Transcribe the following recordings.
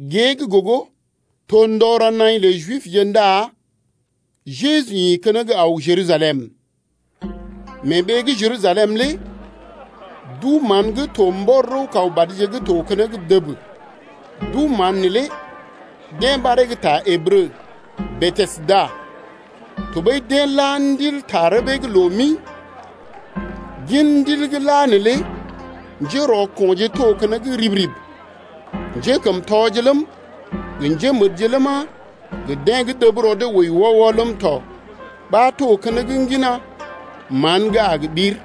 Gée gə́ gogo to ndɔ ra naḭ lə Jibje ndá Jeju ḭ keneŋ aw Jerusalem. Mee ɓee gə́ Jerusalem lé duu-mán gə́ to mbɔr rəw-kaw badje’g to keneŋ dəb, duu-mán neelé deḛ ɓaree gə ta Ǝbrə, Betesda tɔɓəi deḛ la ndil ta rəbee’g loo mi. Gin ndil gə́ la neelé njérɔko̰je to keneŋ rib-rib: njékəmtɔje ləm, gə njémədje ləma, gə deḛ gə́ dəb rɔ dee wəi wɔ-wɔ ləm tɔ ɓa to keneŋ ŋgina mán gə́ a gə ɓir.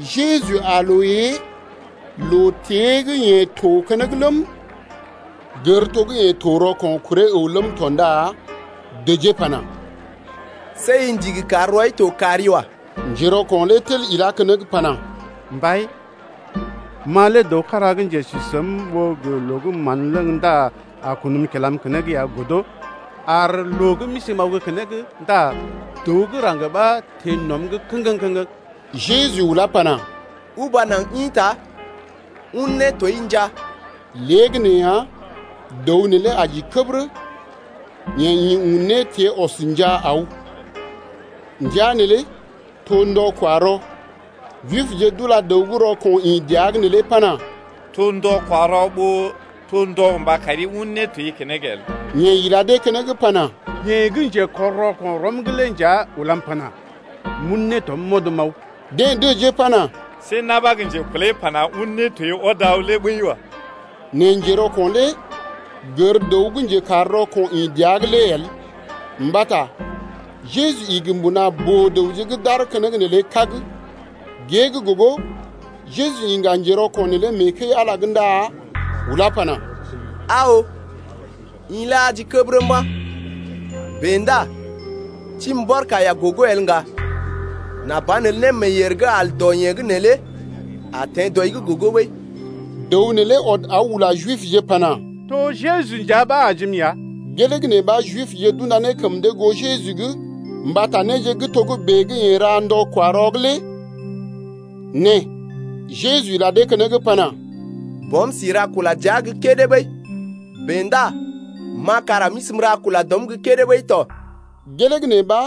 Jeju aa loo ée loo-tée gə́ yeḛ to keneŋ ləm, gər to gə́ yeḛ to rɔko̰ kuree əw ləm tɔ ndá dəjee pana: See i ndigi kar rɔi to kari wa. Njerɔko̰ lé tel ilá keneŋ pana: Mbai, ma lé dəw kára gə́ njesi səm ɓó loo gə́ mán ləŋg ndá a kunm kilam keneŋ ya godo, ar loo gə́ m’isi m’aw gə́ keneŋ ndá dəw gə́ raŋg ɓa teḛ nɔm’g kəŋgəŋ-kəŋgəŋ. Jeju ulá pana: Uba naŋg ḭta, un nétoi njaa. Léegəneeya dəw neelé aji kəbərə. Yeḛ ḭ un nétiee ɔs njaa aw. Ndəa neelé to ndɔ-kwa-rɔ. Jibje d’ula dəw gə́ rɔko̰ ḭ dəa’g neelé pana: To ndɔ-kwa-rɔ ɓó to ndɔ gə mba kari un nétoi keneŋ el. Yeḛ ila dee keneŋ pana: Yeḛ gə́ njekɔr rɔko̰ rɔm’g lé nja ulam pana: M’un nétom m’ɔd m’aw. Deḛ dəjee pana: See na̰ ɓa gə́ njekulai pana: Un nétoi ɔd aw lé ɓəi wa. Nɛ njerɔko̰ lé gər dəw gə́ njekar rɔko̰ ḭ dəa’g lé el, mbata Jeju igi mbuna boo-dəwje gə́ d’aar keneŋ neelé kág. Gée gə́ gogo Jeju iŋga njerɔko̰ neelé mee kəi-Ala’g ndá ulá pana: Aa oo, i lé aji kəbərə mba̰, bèe ndá tibi mbɔr kaiya gogo el ŋga, nà banelə némeeyèr gə́ al dɔ yee gə́ neelé a teḛ dɔi’g gogo ɓəi. Dəw neelé ɔd aw ula Jibje pana: To Jeju nja ɓa ajim ya. Gelee gə́ nee ɓa Jibje d’unda ne kəm dee goo Jeju’g mbata néje gə́ togə́bè gə́ yeḛ ra ndɔ-kwa-rɔ’g lé. Nɛ Jeju ila dee keneŋ pana: Bɔm si ra kula dəa gə́ kédé ɓəi, bèe ndá ma kara m’isi m’ra kula dɔm gə́ kédé ɓəi tɔ. Gelee gə́ nee ɓa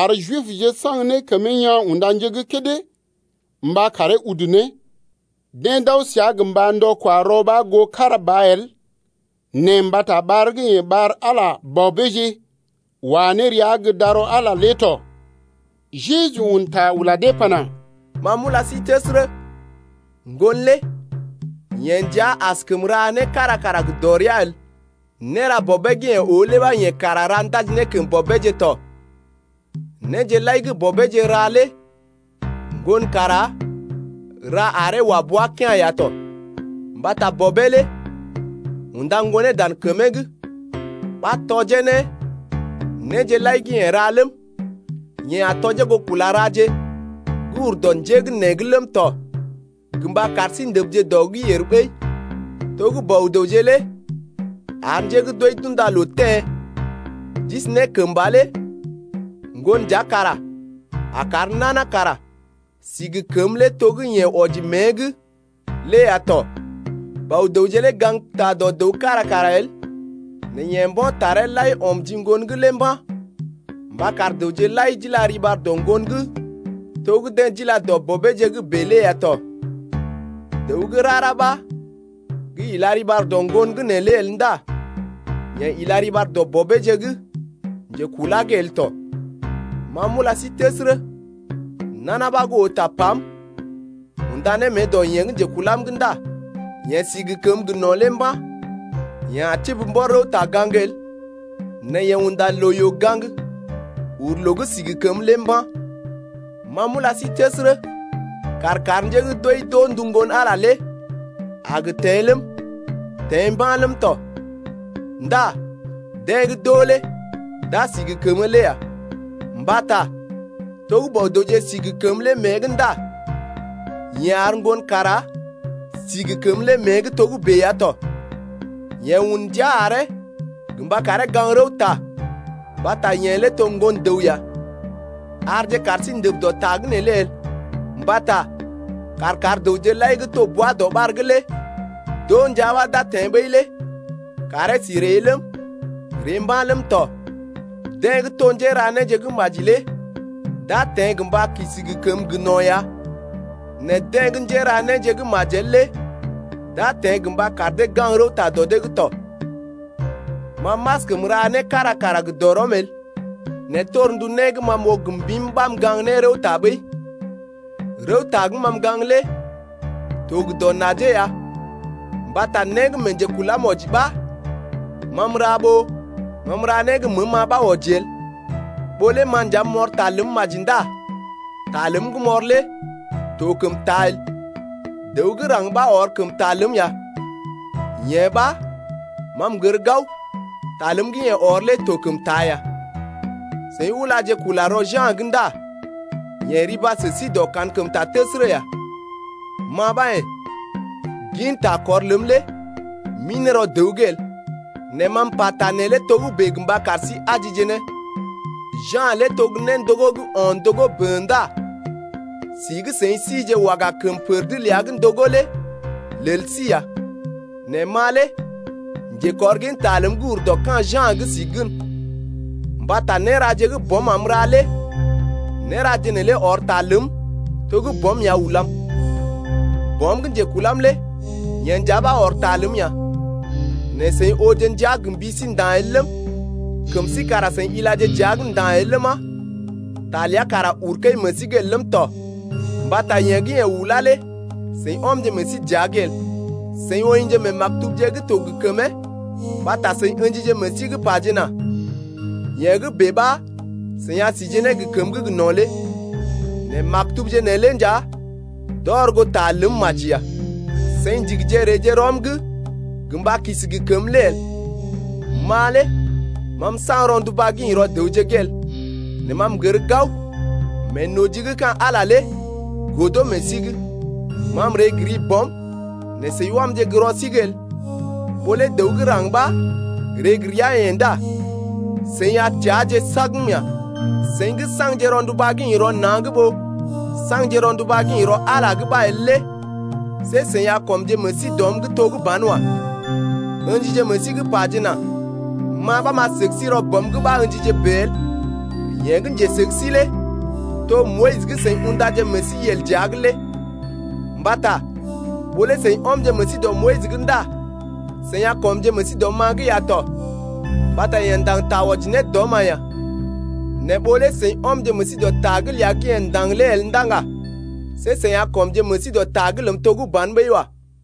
ar Jibje saŋg ne kəmee yaa̰ unda nje gə́ kédé mba karee udu ne. Deḛ d’aw səa gə́ mba ndɔ-kwa-rɔ ɓa goo kára ba el nɛ mbata ɓar gə́ yeḛ ɓar Ala bɔbeeje wa ne rəa gə́ darɔ Ala lé tɔ. Jeju un ta ula dee pana: Ma m’ula sí təsərə, Ŋgon lé yeḛ nja askəm ra né kára kara gə dɔrea el, néra Bɔbeeje gə́ yeḛ oo lé ɓa yeḛ kara ra ndaji ne kəm Bɔbeeje tɔ. Néje lai gə́ Bɔbeeje ra lé Ŋgon kara ra aree wa bua kea̰ ya tɔ. Mbata Bɔbeeje lé unda Ŋgonee dan kəmee’g ɓa tɔjee ne néje lai gə́ yeḛ ra ləm, yeḛ a tɔjee goo kula raje gə́ ur dɔ njé gə́ nee’g ləm tɔ gə mba kar sí ndəbje dɔ’g yèr ɓəi. To gə́ Bɔ-dəwje lé ar njé gə́ d’wəi d’unda loo teḛ d’isi ne kəmba lé Ŋgon nja kara a kar nana kara si gə kəmə lé to gə́ yeḛ wɔji mée’g lé ya tɔ. Bɔ-dəwje lé gaŋgta dɔ dəw kára kara el, nɛ yeḛ mbo̰ taree lai ɔm ji Ŋgon’g lé mba̰ mba kar dəwje lai d’ila riɓar dɔ Ŋgon’g to gə́ deḛ d’ila dɔ Bɔbeeje’g bèe lé ya tɔ. Dəw gə́ rara ɓa gə́ ila riɓar dɔ Ŋgon’g neelé el ndá yeḛ ila riɓar dɔ Bɔbeeje gə́ njekulá’g el tɔ. Ma m’ula sí təsərə, nana ɓa gə́ oo tapam unda ne mée dɔ yeḛ gə́ njekulam’g ndá yeḛ si gə kəməgə́ gə no̰ lé mba̰, yeḛ a tibi mbɔr rəwta-gaŋg el nɛ yeḛ unda loo-yoo gaŋg uru loo gə́ si gə kəmə lé mba̰. Ma m’ula sí təsərə, kàr kar njé gə́ d’wəi d’oo ndu Ŋgon-Ala lé a gə teḛ ləm, teḛ mba̰ ləm tɔ. Ndá deḛ gə́ d’oo lé d’a si gə kəmə lé ya. Mbata to gə́ Bɔ-dəwje si gə kəmə lé mée’g ndá yeḛ ar Ŋgon kara si gə kəmə lé mée’g togə́bè ya tɔ. Yeḛ un ndia aree gə mba karee gaŋg rəwta mbata yeḛ lé to gə́ Ŋgon-dəw ya. Arje kaar sí ndəb dɔ ta’g neelé el, mbata kàr kar dəwje lai gə́ to bwa-dɔɓar’g lé d’oo ndia ɓa d’a teḛ ɓəi lé kàree si ree ləm, ree mba̰ ləm tɔ. Deḛ gə́ to njéra néje gə́ maji lé d’a teḛ gə mba kisi gə kəmə gə́ gə no̰ ya nɛ deḛ gə́ njéra néje gə́ majel lé d’a teḛ gə mba kar dee gaŋg rəwta dɔ dee’g tɔ. Ma m’askəm ra né kára kara gə dɔrɔm el, nɛ torndu né gə́ ma m’oo gə mbim ɓa m’gaŋg ne rəwta ɓəi. Rəwta gə́ ma m’gaŋg lé to gə dɔ najee ya mbata né gə́ mee njekulam wɔji ɓa ma m’ra ɓó ma m’ra né gə́ məəm-ma ɓa wɔji el. Ɓó lé ma nja m’ɔr ta ləm maji ndá ta ləm gə́ m’ɔr lé to kəm taa el. Dəw gə́ raŋg ɓa ɔr kəm ta ləm ya, yee ɓa ma m’gər gao, ta ləm gə́ yeḛ ɔr lé to kəm taa ya. Seḭ ulaje kula rɔ Ja̰’g ndá yeḛ riba sə sí dɔ kankəmta təsərə ya. Ma ɓa yḛ̀, gin takɔr ləm lé m’ḭ ne rɔ dəw’g el. Nɛ ma m’pata neelé togə́bè gə mba kar sí ajije ne. Ja̰ lé to gə́ néndogó gə́ o̰ ndogó bən ndá si gə́ seḭ sije waga kəm pər’d ləa gə́ ndogó lé lel sí ya. Nɛ ma lé njekɔrginta ləm gə́ ur dɔ ka̰ Ja̰’g si gən, mbata néraje gə́ Bɔm am m’ra lé néraje neelé ɔr ta ləm to gə́ Bɔm ya ulam. Bɔm gə́ njekulam lé yeḛ nja ɓa ɔr ta ləm ya. Nɛ seḭ ooje ndia gə mbi sí nda̰ el ləm, kəm sí kara seḭ ilaje dəa’g nda̰ el ləma, ta ləa kara uru kəi meḛ sí’g el ləm tɔ, mbata yeḛ gə́ yeḛ ulá lé seḭ ɔmje meḛ sí dəa’g el. Seḭ woḭje mee maktubje gə́ to gə kəmee mbata seḭ ə̰jije meḛ sí’g pajena: Yee gə́ bèe ɓa seḭ a si ne gə kəmə gə́ gə no̰ lé. Nɛ maktubje neelé nja d’ɔr goo ta ləm maji ya. Seḭ ndigije reeje rɔm’g gə mba kisi ne gə kəmə lé el. Ma lé ma m’saŋg rɔnduba gə́ ḭ rɔ dəwje’g el. Nɛ ma m’gər gao meenoji gə́ ka̰ Ala lé godo meḛ sí’g. Ma m’ree gə ri Bɔm nɛ seḭ wamje gə́ rɔ sí’g el, ɓó lé dəw gə́ raŋg ɓa ree gə ria-yeḛ ndá seḭ a teaje sagm ya. Seḭ gə́ saŋgje rɔnduba gə́ ḭ rɔ na̰’g ɓó saŋgje rɔnduba gə́ ḭ rɔ Ala’g ɓa el lé see seḭ a kɔmje meḛ sí dɔm’g to gə́ banwa. Ǝ̰jije meḛ sí’g pajena: Ma ɓa m’a səg sí rɔ Bɔm’g ɓa ə̰jije bèe el, yeḛ gə́ njesəg sí lé to Moyis gə́ seḭ undaje meḛ sí yel gə́ dəa’g lé. Mbata ɓó lé seḭ ɔmje meḛ sí dɔ Moyis’g ndá seḭ a kɔmje meḛ sí dɔm-ma’g ya tɔ mbata yeḛ ndaŋg ta wɔji ne dɔm-ma ya. Nɛ ɓó lé seḭ ɔmje meḛ sí dɔ ta’g ləa gə́ yeḛ ndaŋg lé el ndá ŋga, see seḭ a kɔmje meḛ sí dɔ ta’g ləm to gə́ ban ɓəi wa.